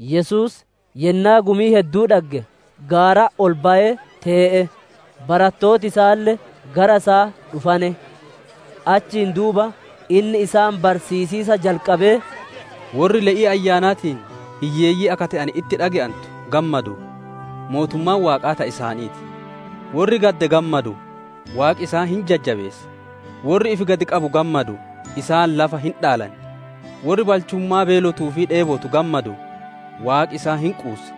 Yesuus yennaa gumii hedduu dhagge, gaaratti ol bayee tee'e; barattooti isaalle gara isaa dhufane. Achiin duuba inni isaan barsiisiisa jalqabee: «Worri le'ii Ayyaanaatiin hiyyeeyyii akka te'ane itti dhage'antu gammaduu; mootummaan Waaqaa ta isaanii ti! Worri gadde gammaduu; Waaqi isaan hin jajjabeessa! Worri ifi gad qabu gammaduu; isaan lafa hin dhaalan! Worri balchummaa beelotuu fi dheebotu gammaduu; Waaqi isaan hin quussa.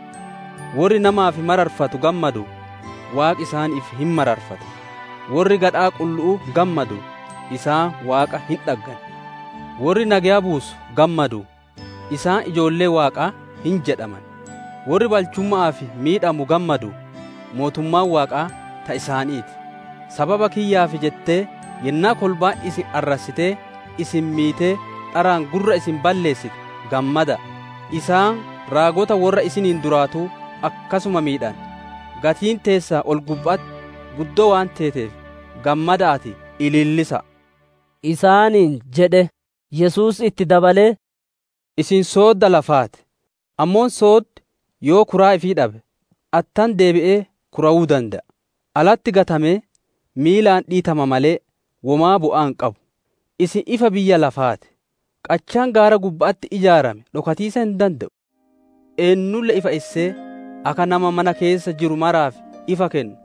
Worri namaaf mararfatu gammaduu; Waaqi isaaniif hin mararfata! Worri gadhaa qullu'uu gammaduu; isaan Waaqa hin dhaggan! Worri nageya buusu gammaduu; isaan ijoollee Waaqaa hin jedhaman! Worri balchumma'aaf miidhamu gammaduu; mootummaan Waaqaa ta isaanii ti! «Sababa kiyyaaf jettee yennaa kolbaan isin arrassitee, isin miitee, dharaan gurra isin balleessite gammmada'a. Isaan raagota worra isiniin duraatuu akkasuma miidhane. Gatiin teessan ol-gubba'atti guddoo waan teeteef, gammada'aatii ilillisa'a» isaaniin jedhe. Yesuus itti dabalee, «Isin soodda lafaa ti; ammoo sooddi yoo kuraa ifii dhabe, attam deebi'ee kuraawuu dande'a? Alatti gatamee miilaan dhiitama malee, womaa bu'aa hin qabu. «Isin ifa biyya lafaa ti. Qachaan gaara gubba'atti ijaarame dhokatiisa hin dande'u. Eennulle ifa issee, akka nama mana keessa jiru maraaf ifa kennu,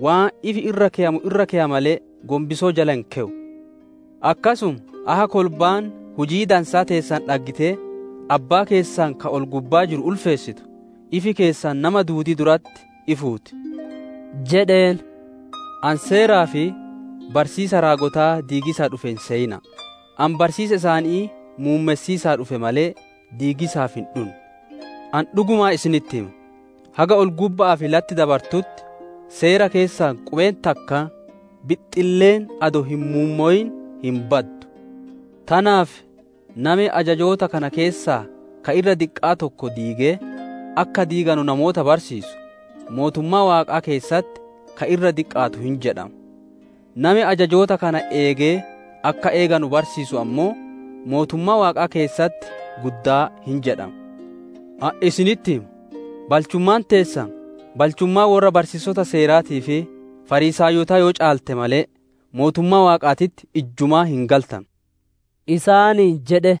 waan ifi irra keyamu irra keya malee, gonbisoo jala hin keyu. Akkasuma akka kolbaan hujii dansaa teessan dhaggitee Abbaa keessan ka ol-gubbaa jiru ulfeessitu, ifi keessan nama duudii duratti ifuu ti» jedheen. Yesuus, «Ani Seeraa fi barsiisa raagotaa diigiisa dhufe hin seyina'a. Ani barsiisa isaanii muummessiisaaf dhufe malee, diigiisaaf hin dhunne. Ani dhugumaan isinitti hima, haga ol-gubba'aa fi latti dabartutti Seera keessaa qubeen takkaan, bixxilleen adoo hin muummowin hin baddu. Tanaaf nami ajajoota kana keessaa ka irra diqqa'aa tokko diigee, akka diiganu namoota barsiisu, mootummaa Waaqaa keessatti ka irra diqqaatu hin jedhama; nami ajajoota kana eegee akka eeganu barsiisu ammoo, mootummaa Waaqaa keessatti guddaa hin jedhama. Ani isinitti hima, balchummaan teessan balchummaa worra barsiisota Seeraatii fi Fariisaayotaa yoo caalte malee, mootummaa Waaqaatitti ijjumaa hin galtanu» isaaniin jedhe.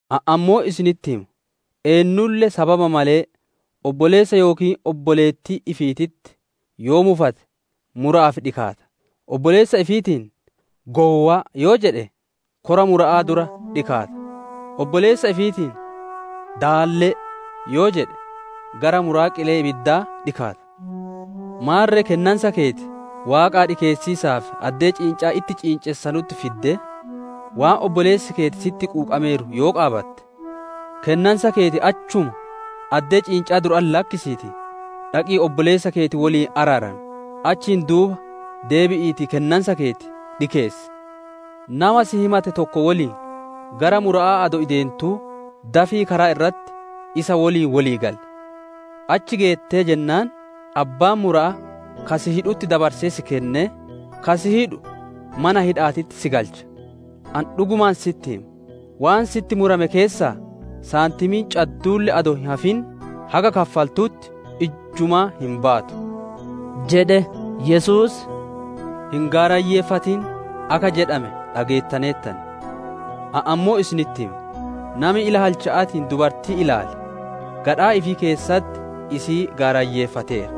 Ani ammoo isinitti hima, eennulle sababa malee obboleessa yookiin obboleettii ifiititti yoo mufate mura'aaf dhikaata; obboleessa ifiitiin, ‹Gowwa'a!› yoo jedhe, kora mura'aa dura dhikaata; obboleessa ifiitiin, ‹Daallee!› yoo jedhe gara muraa qilee ibiddaa dhikaata. Maarre kennansa keeti Waaqaa dhikeessiisaaf addee ciincaa itti ciincessanutti fiddee, waan obboleessi keeti sitti quuqameeru yoo qaabatte, kennansa keeti achuma addee ciinca'aa duratti lakkisiitii, dhaqii obboleessa keeti woliin araaramii, achiin duuba deebi'iitii kennansa keeti dhikeessi. «Nama si himate tokko woliin gara mura'aa adoo ideentuu dafii karaa irratti isa woliin wolii gali. Achi geettee jennaan, abbaan mura'aa ka si hidhutti dabarsee si kennee, ka si hidhu mana hidha'aatitti si galcha. Ani dhugumaan sitti hima, waan sitti murame keessaa saantimiin cadduulle adoo hin hafin haga kaffaltutti ijjumaa hin baatu» jedhe. Yesuus, « ‹Hin gaarayyeeffatin› akka jedhame dhageettaneertan. Ani ammoo isinitti hima: nami ila halcha'aatiin dubartii ilaale, gadhaa ifii keessatti isii gaarayyeeffateera.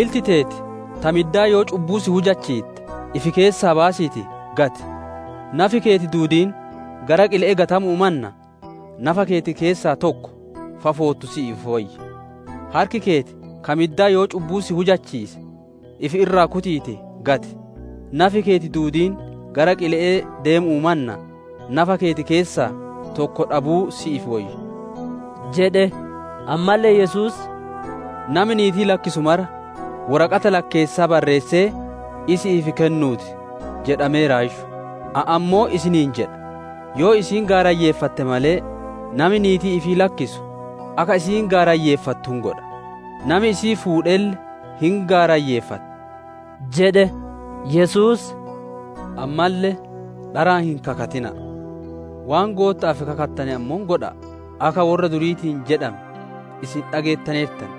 Ilti teeti ta middaa yoo cubbuu si hujisiitte, ifi keessaa baasiitii gati; nafi keeti duudiin gara qile'ee gatamu'uu mannaa, nafa keeti keessaa tokko fafoottu si'iif woyya. Harki keeti ka middaa yoo cubbuu si hujisiise, ifi irraa kutiitii gati; nafi keeti duudiin gara qile'ee deemu'uu mannaa, nafa keeti keessaa tokko dhabuu si'iif woyya» jedhe. Ammalle Yesuus, « ‹Nami niitii lakkisu mara woraqata lakkeessaa barreessee isi'iif kennuu ti› jedhameeraayyu. Ani ammoo isiniin jedha, yoo isiin gaarayyeeffatte malee, nami niitii ifii lakkisu, akka isiin gaarayyeeffattu hin godha; nami isii fuudhelle hin gaarayyeeffata» jedhe. Yesuus, «Ammalle, ‹Dharaan hin kakatina'a; waan Gootta'aaf kakattane ammoo godha'a› akka worra duriitiin jedhame isin dhageettaneertan.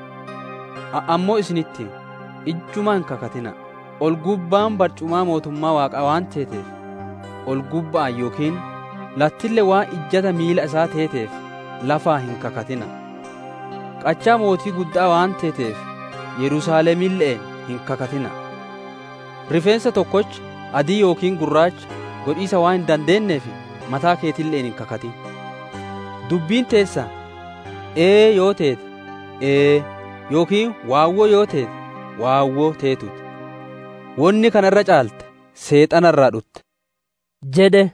Ani ammoo isinitti hima, ijjumaa hin kakatina'a. Ol-gubbaan barcumaa mootummaa Waaqaa waan teeteef, ol-gubba'aan yookiin, lattille waan ijjata miila isaa teeteef lafaan hin kakatina'a; qachaa mootii gudda'aa waan teeteef Yerusaalemille'een hin kakatina'a. Rifeensa tokkocha adii yookiin gurraacha godhiisa waan hin dandeenneef, mataa keetille'een hin kakatin. Dubbiin teessan ‹Ee› yoo teete ‹Ee›, yookiin ‹Waawwoo› yoo teete ‹Waawwoo› teetuu ti; wonni kana irra caale seexana irraa dhutte» jedhe.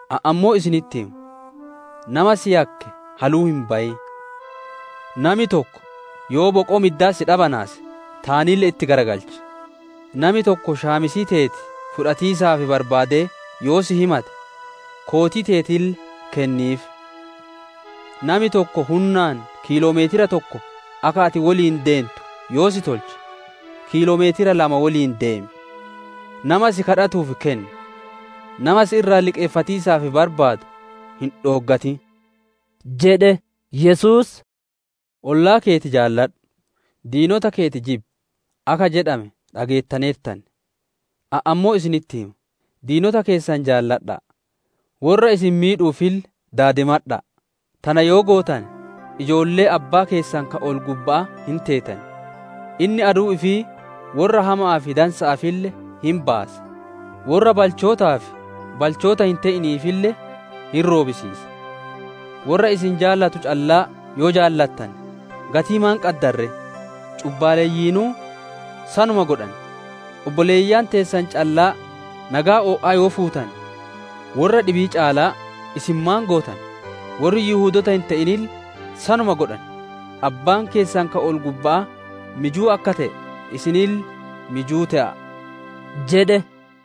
Ani ammoo isinitti hima: nama si yakke haluu hin bayin. Nami tokko yoo boqoo middaa si dhabanaase, taanille itti garagalchi; nami tokko shaamisii teeti fudhatiisaaf barbaadee yoo si himate, kootii teetille kenniif. Nami tokko hunnaan kiiloo meetira tokko akka ati woliin deentu yoo si tolche, kiiloo meetira lama woliin deemi. Nama si kadhatuuf kenni; nama si irraa liqeeffatiisaaf barbaadu hin dhooggatin» jedhe. Yesuus, « ‹Ollaa keeti jaaladhu, diinota keeti jibbi› akka jedhame dhageettaneertan. Ani ammoo isinitti hima: diinota keessan jaaladha'a; worra isin miidhuufille daadimadha'a. Tana yoo gootane ijoollee Abbaa keessan ka ol-gubba'aa hin teetan; inni aduu ifii worra hama'aa fi dansa'aafille hin baasa; worra balchootaa fi balchoota hin te'iniifille hin roobisiisa. Worra isin jaalatu callaa yoo jaalattane, gatii maan qaddan ree? Cubbaaleyyiinuu sanuma godhan! Obboleeyyan teessan callaa nageya o'aa yoo fuutane, worra dhibii caalaa isin maan gootane? Worri Yihudoota hin te'inille sanuma godhan! Abbaan keessan ka ol-gubba'aa mijuu akka te'e, isinille mijuu te'a'a» jedhe.